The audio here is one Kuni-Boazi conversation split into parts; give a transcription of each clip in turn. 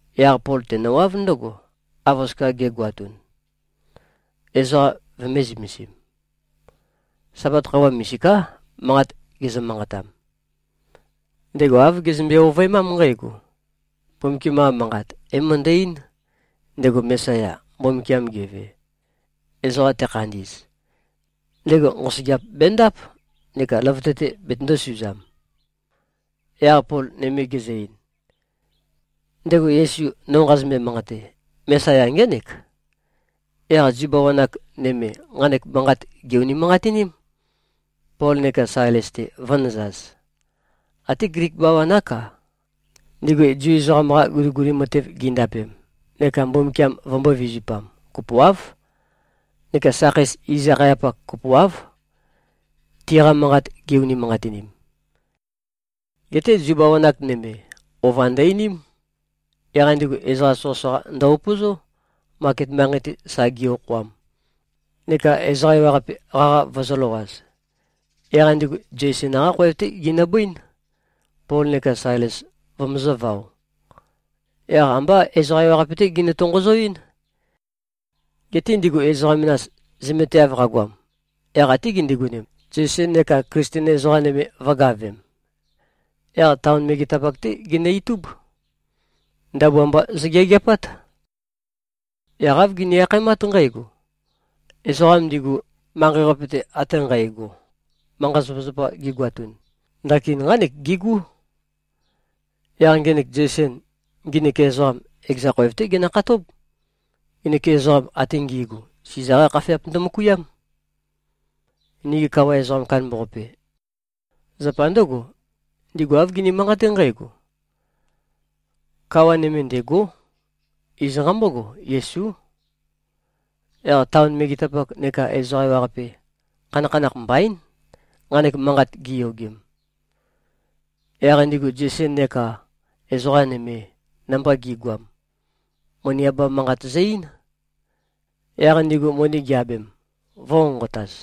Yaq Pol tenøwáv ndǿgo, av oskia ge꞉goatun, ezoqa vømē-zømesim. Sabat khøuwa misiká, manqat gezø-manqatam. Ndego āv gezømbe-ovøemám nqǽgo: Mbumbukiam-qa Manqat é-møndø-eín, ndego Mesaya, Mbumbukiam geve, ezoqam tekhandi꞉z, ndego nqosøgeap bendáp, neka løvøte-te betøndō-suzam. Yaq Pol nøme gezø-ein, “Ndego Yesu, no nqazømbe-manqate, Mesaya ngének.” Yaq Zu bawan-ak nøme, nqanek manqat gè-unimanqatiním, Pol neka Sailes-te vø̄nøzaz. Até Glik bawan-ák-a, ndigu Zu ezoqam-qa guliguli matev gindapem neka Mbumbukiam vømbō-vizupam, kopoáv, neka sakhei iz-akhayapak kopoáv, tiqa manqat gi-unimanqatinim. Geté Zu bawan-ak nøme, ova ndø-einím. Yaq ndigu ezoqa soqøsoqa ndø-upøzó, maket manqei-te sa gi-okhoam, neka ezoqa ewaqape qaqa vøzø̄løwaz. Yaq ndigu Zeisen-qá khoev-té ginøbøín, Pol neka Sailes vømøzø̄vao. Yaq ambá ezoqa ewaqape-té ginø-tonqozoɨ́n. Geté ndigu ezoqa menas, zømeteav qagoam, yaq até gindigonem, Zeisen neka Klisten ezoqa nøme vø̄gavem. Yaq taon megetapak-té ginø-itúb. Ndabua mba zøgeageapát. Yaq āv gini-akhaemát nqǽgo, “Ezoqam ndigu, manqei-qape-te ate nqægo, manqa-zapazapa gigoatun, ndakin nqánek gigú. Yaq ngenek Zeisen, nginik ezoqam, ekeza khoev-té genøkhatób. Nginik ezoqam ate ngi꞉gu, Siza-qá khafeap ndømøkuiám, nigi kawa ezoqam kandambaqape. Zapa ndǿgo, ndigu āv gini-manqaté nqǽgo: Kawa nøme ndêgó. Iz nqambógo, Yesú.” Yaq taon megetapak neka ezoqa ewaqape, khanakhanakh mbaín, nqanek manqat giyogem. Yaq ndigu Zeisen neka ezoqa nøme, namba gi꞉goam, moni abam manqat zø-ein. Yaq ndigu moni gi-abem, vø̄nqonqotaz.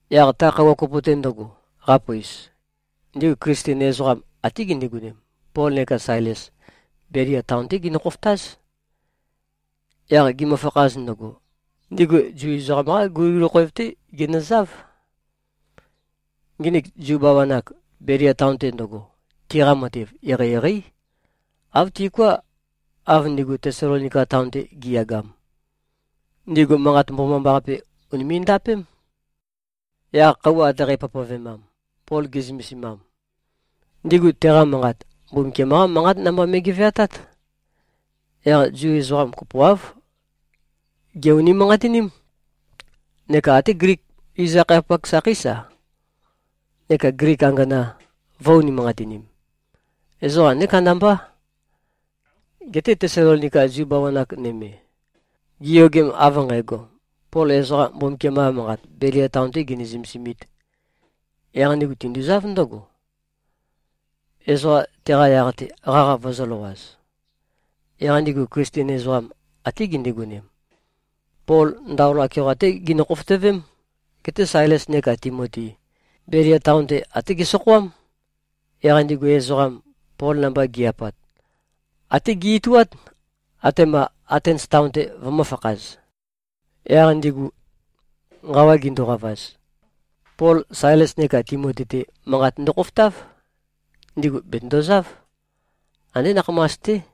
Yaq ta khøuwa kopo-te ndøgo, qapøis, ndigu Klisten ezoqam, até gindigonem, Pol neka Sailes, Belia taon-té ginø-khofotáz. Yaq gimøfakhaz ndøgo, ndigu Zu ezoqam-qá guliguli khoev-té ginøzáv. Nginik Zu bawan-ak, Belia taon-te ndøgo, tiqa matev eqeieqeí, āv tiuká, av ndigu Tesalonika taon-te gi꞉yagam. Ndigu Manqat Mbomambaqape ùnime꞉-ndapém. Yaq khøuwa ate qæpavpavemam, Pol ge꞉zømesimam, ndigu teqa manqat, Mbumbukiam-qá manqat namba me꞉geveatát. Yaq Zu ezoqa kopoáv, gè-unimanqatiním. Neka até Glik iz-akhayapak sakhéis-a, neka Glik angana, vø̄-unimanqatinim. Ezoqa andé kandambá. Geté Tesalonika Zu bawan-ak nøme, giyogem, av nqægo, Pol ezoqa Mbumbukiam-qa Manqat Belia taon-tē genø-zømesimīt, yaq ndigu tinduzáv ndǿgo, ezoqa teqa yaq-te qaqa vøzø̄løwaz. Yaq ndigu Klisten ezoqam, até gindigonem, Pol ndaola keoqa-té ginø-khofotøvém. Geté Sailes neka Timoti, Belia taon-te, até gesokhoám. Yaq ndigu ezoqam, Pol namba gi꞉-apat, até ge-ituát, atema Atens taon-te vømø̄fakhaz. Yaq ndigu nqawa ginduqavaz, Pol Sailes neka Timoti-te manqat ndøkhofotáv. Ndigu bètøndozáv. Andé nakhamas-té.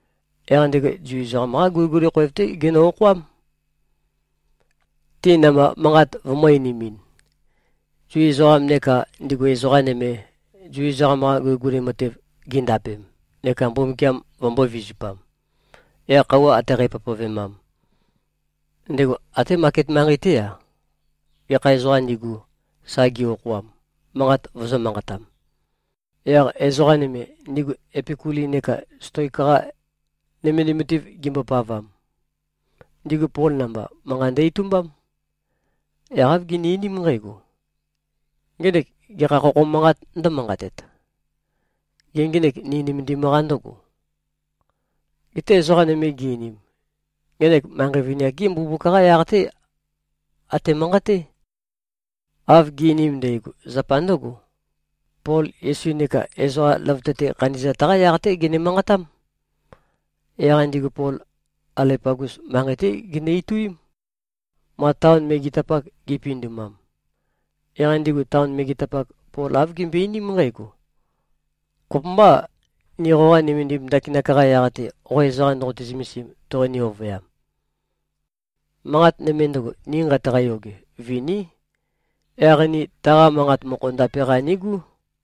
Yaq ndego Zu ezoqam-qá guliguli khoev-té genø-okhoám, ti namba manqat vømø̄-einimin, Zu ezoqam neka ndigu ezoqa nøme, Zu ezoqam-qa guliguli matev gindapem neka Mbumbukiam vømbō-vizupam. Yaq khøuwa ate qæpavpavemam, ndego até maket manqei-té-a, gekha ezoqām ndigu, sa gi-okhoam, manqat vøzø̄-manqatam. Yaq ezoqa nøme, ndigu Epikuli neka Stoik-qa nømendim matev gimbopavam, ndigu Pol namba manqa ndø-itumbám. Yaq āv gini-einím nqǽgo, “Ngenek gekha khokho manqāt ndǿmanqatet? Gê, ngenek ni nømendim-qa ndǿgo?” Geté ezoqa nøme gi-einim, “Ngenek manqei vini-ak-gí mbumbuk-qá yaq-té ate꞉-manqaté.” Av gi꞉-einim ndægo, zapa ndǿgo: Pol Yesu neka ezoqa løvøte-te khandi꞉zat-qá yaq-té gene-manqatám. Yaq ndigu Pol Aleopagus manqei-té ginø-ituím, ma taon megetapak gi꞉pindumam. Yaq ndigu taon megetapak, Pol āv gimbøe-einím nqǽgo, “Kopømbâ, ni qoqa nømendim ndakinak-qa yaq-te, qo ezoqa ndoqote-zømesim, toqoni-ovøyam? Manqat nøme ndøgo, ni nqeitaqa-yoge, viní. Yaq ni taqa manqa mokho ndape-qa nigú.”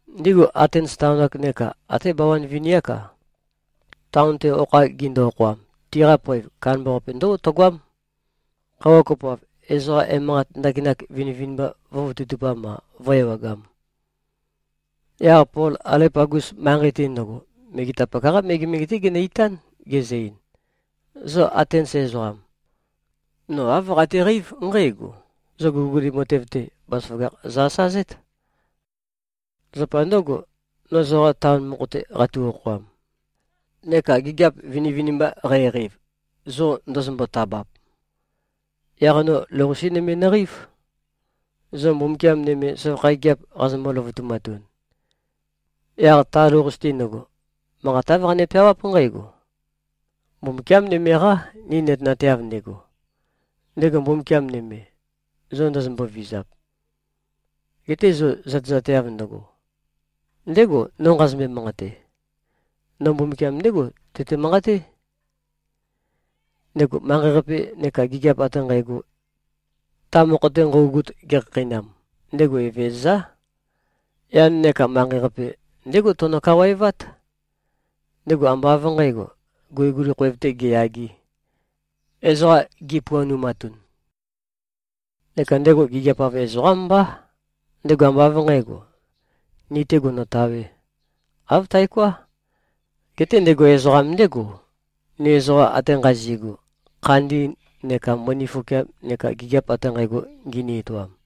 (Ndigu Atens taon-ak, neka até bawan vini-ák-a, taon-te okha gindu-okhoam, tiqa poev kandambaqape ndǿgo tøgoám, khøuwa kopoav, ezoqa emanqat ndakinak vinivinimba vø̄vototupam-a, vø̄-ewagam.) Yaq Pol, Aleopagus manqei-te ndøgo, megetapak-qá megemege-té genø-itán, gezø-ein, “Zo Atens ezoqam. No āv qateqeív nqǽgo: Zo guliguli matev-te, bazaføgakh zo-asazét. Zapa ndǿgo, no zoqa taon mokho-te qatu-okhoam, neka gigiap vinivinimba qæqeiv, zo ndozombo-tabap, yaq no lou-qase nøme nøqeív, zo mbumbukiam nøme søvakha gigiap qazombo-løvutumatun. Yaq ta lou-qase-te ndøgo, manqat āv qane-peawáp nqǽgo, ‘Mbumbukiám nøme-qá, ni nøtenateav ndego.’ Ndego Mbumbukiam nøme, zo ndozombo-vizap, gete zo zøtezateav ndøgo, ndégo, no nqazømbe-manqate. No Mbumbukiam ndégo tøte-manqaté, ndego manqei-qape neka gigiap ate nqægo, ta mokho-te nqøugut, gekhakheinam. Ndego Evezøzá. Yan neka manqei-qape ndégo teno-kawaevát. Ndego ambá av nqǣgo, guliguli khoev-tē geyagē, ezoqa gipuanumatun. Neka ndego gigiap-av ezoqám mbá. Ndego ambá av nqǣgo, ni-tē gonotawē. Āv taoká. Geté ndego ezoqam ndégo, ni ezoqa ate nqazi꞉gu, khandi neka mbøni fokeam neka gigiap ate nqægo ngini-etoam.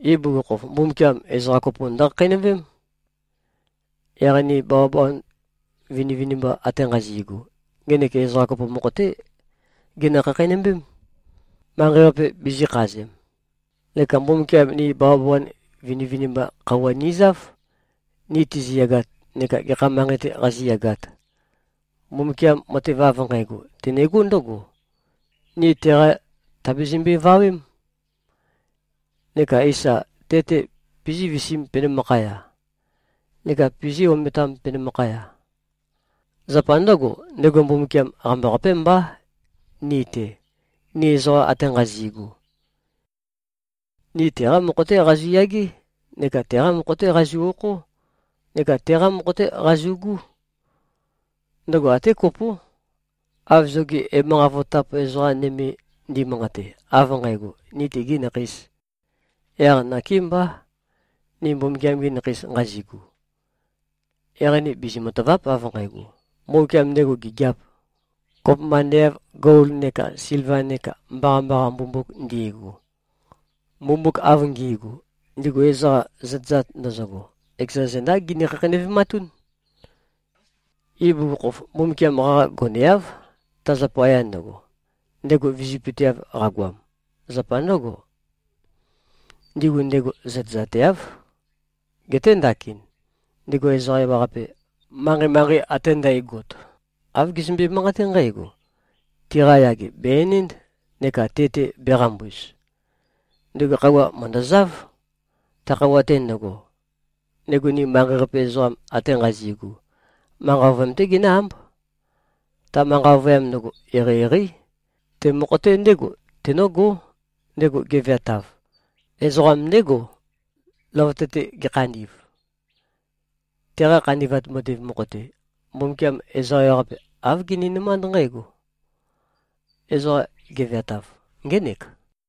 Ibugukhokhof, Mbumbukiam ezoqa kopo ndøkhakheinøvém. Yaq ni bawabawan vinivinimba ate nqazi꞉gu, ngenek ezoqa kopo mokho-té genø-khakheinømbém, manqei-qape bizīkhazem. Neka Mbumbukiam ni bawabawan vinivinimba khøuwa nizáv, ni tiziyagat neka gekha manqei-te qazíyagāt. Mbumbukiam matev av nqægo, tenegó ndǿgo. Ni teqa tàbizimbøe-vawém, neka eísa, te-te pizí-visiīm penømakhaya, neka pizí-ometām penømakhaya. Zapa ndǿgo, ndego Mbumbukiam qambaqapé mbá ni-te, ni ezoqam ate nqazi꞉gu. Ni teqá mokho-té qazu꞉yagé, neka teqá mokho-té qazu꞉-okhó, neka teqá mokho-té qazu꞉gú. Ndøgo até kopó, av zogi emanqat vototap ezoqa nøme ndimanqate, av nqægo, ‘Ni tegī nakheīs.’ Yaq nakémbá, ni Mbumbukiam-gi nakheis nqazigu, yaq ni bizi-matàva᷄p, av nqægo, ‘Mbumbukiam ndego gigiāp, kopømba ande av gol neka silva neka mbaqambaqa mbumbuk ndi꞉gu. Mbumbuk av ngi꞉gu, ndigu ezoqa zøtezat ndøzøgo, ekeza zendá gini-khakheinøvematún.’ Ibugukhokhof, Mbumbukiam qaqa goneáv, ta zapaya ndøgo, ndego vizøpøteav qagoam. Zapa ndǿgo, ndigu ndego zøtezateáv. Geté ndakin, ndego ezoqa ewaqape, manqei-manqei ate ndægot, āv gezømbe-manqaté nqǽgo, tiqa yage bè-enénd neka te-te bēqambuz. Ndego khøuwa mø̀ndøzáv. Ta khøuwa-te ndøgo, ndego ni manqei-qape ezoqam ate nqazi꞉gu, manqa ovøyam-té genǿ-ámb. Ta manqa ovøyam ndøgo, eqeieqeí. Te mokho-te ndégo tenǿgó, ndego geveatav. Ezoqam ndégo, løvøte-te gekhandi꞉v. Teqa khandi꞉vat matev mokho-te, Mbumbukiam ezoqa ewaqape, āv gininømánd nqǽgo: Ezoqam geveatav ngének.”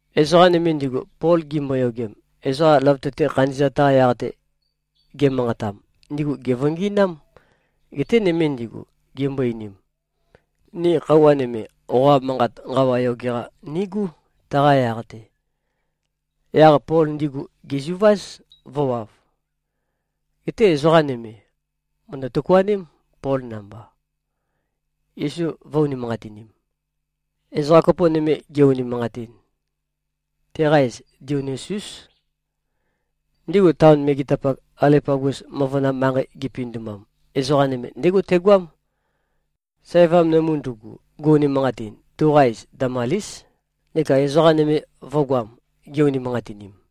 Ezoqa nøme ndigu, Pol gimboyogem, ezoqa løvøte-te khandi꞉zat-qa yaq-te ge꞉manqatam, ndigu gèvøngi꞉nám. Geté nøme ndigu, gimbo-einim, “Ni khøuwa nøme, qoqa manqat nqawa yoge-qa nigú, taqa yaq-te.” Yaq Pol ndigu gèzuváz, vø̄wav. Geté ezoqa nøme, mø̀ndø-tøkuaném, Pol namba, Yesu vø̄-unimanqatinim. Ezoqa kopo nøme ge-unimanqatin, teqa iz Dionisiús. Ndigu taon megetapak, Aleopagus møvøna manqei gipindumam, ezoqa nøme ndégo tegoám. Sævam nømu ndugu, gu-unimanqatin, tuqa iz Damalís, neka ezoqa nøme vø̄goam, gi-unimanqatinim.